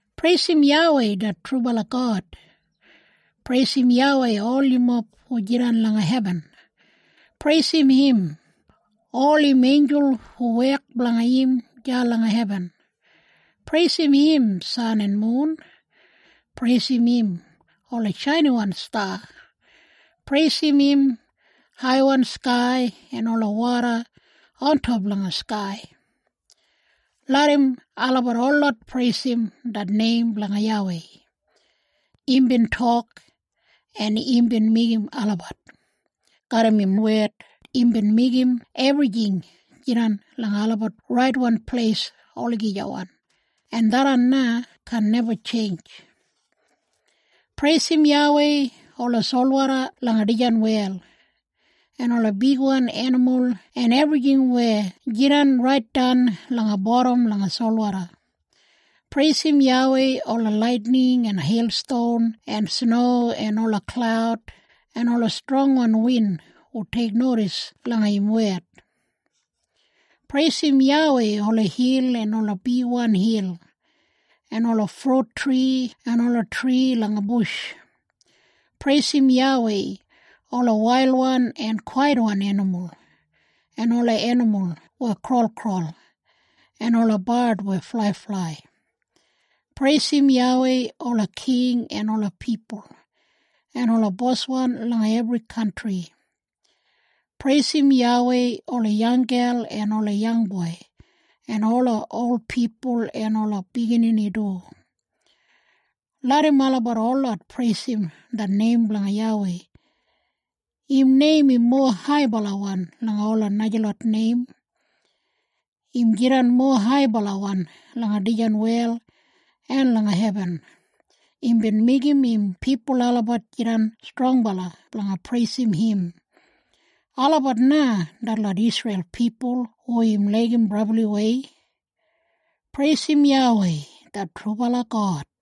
Preisim YAWEI det trubala God! Preisim YAWEI ol yumob hu jidan langa hebin. Preisim im, ol im einjul hu wek blanga im deya langa hebin. Preisim im, san en mun. Preisim im, ola shainiwan sta. Preisim im, haiwan skai, en ola woda ontop langa skai. Larram olabat holot preisim det neim blanga YAWEI. Imbin tok, en imbin meigim olabat. Garram im wed imbin meigim ebrijing jidan langa olabat raitwan pleis olagijawan, en tharran na kaan neba tjeinj. Preisim YAWEI, ola solwoda langa dijan wel, en ola bigwan enimul en ebrijing weya jidan raitdan langa bodam langa solwoda. Preisim YAWEI ola laitining en heilston en sno en ola klaud en ola strongwan win hu teiknodis langa im wed. Preisim YAWEI ola hil en ola bigwan hil, en ola frut tri en ola tri langa bush. Preisim YAWEI ola wailwan en kwaitwan enimul, en ola enimul weya kraulkraul, en ola bard weya flaiflai. Preisim YAWEI ola king en ola pipul, en ola boswan langa ebri kantri. Preisim YAWEI ola yanggel en ola yangboi, en ola ol pipul en ola biginini du. Larram olabat holot preisim det neim blanga YAWEI! Im neim im mowa haibalawan langa ola najalot neim. Im jidan mowa haibalawan langa dijan wel en langa hebin. Imbin meigim im pipul olabat jidan strongbala blanga preisim im. Olabat na detlot Isreil pipul hu im laigim brabliwei. Preisim YAWEI det trubala God!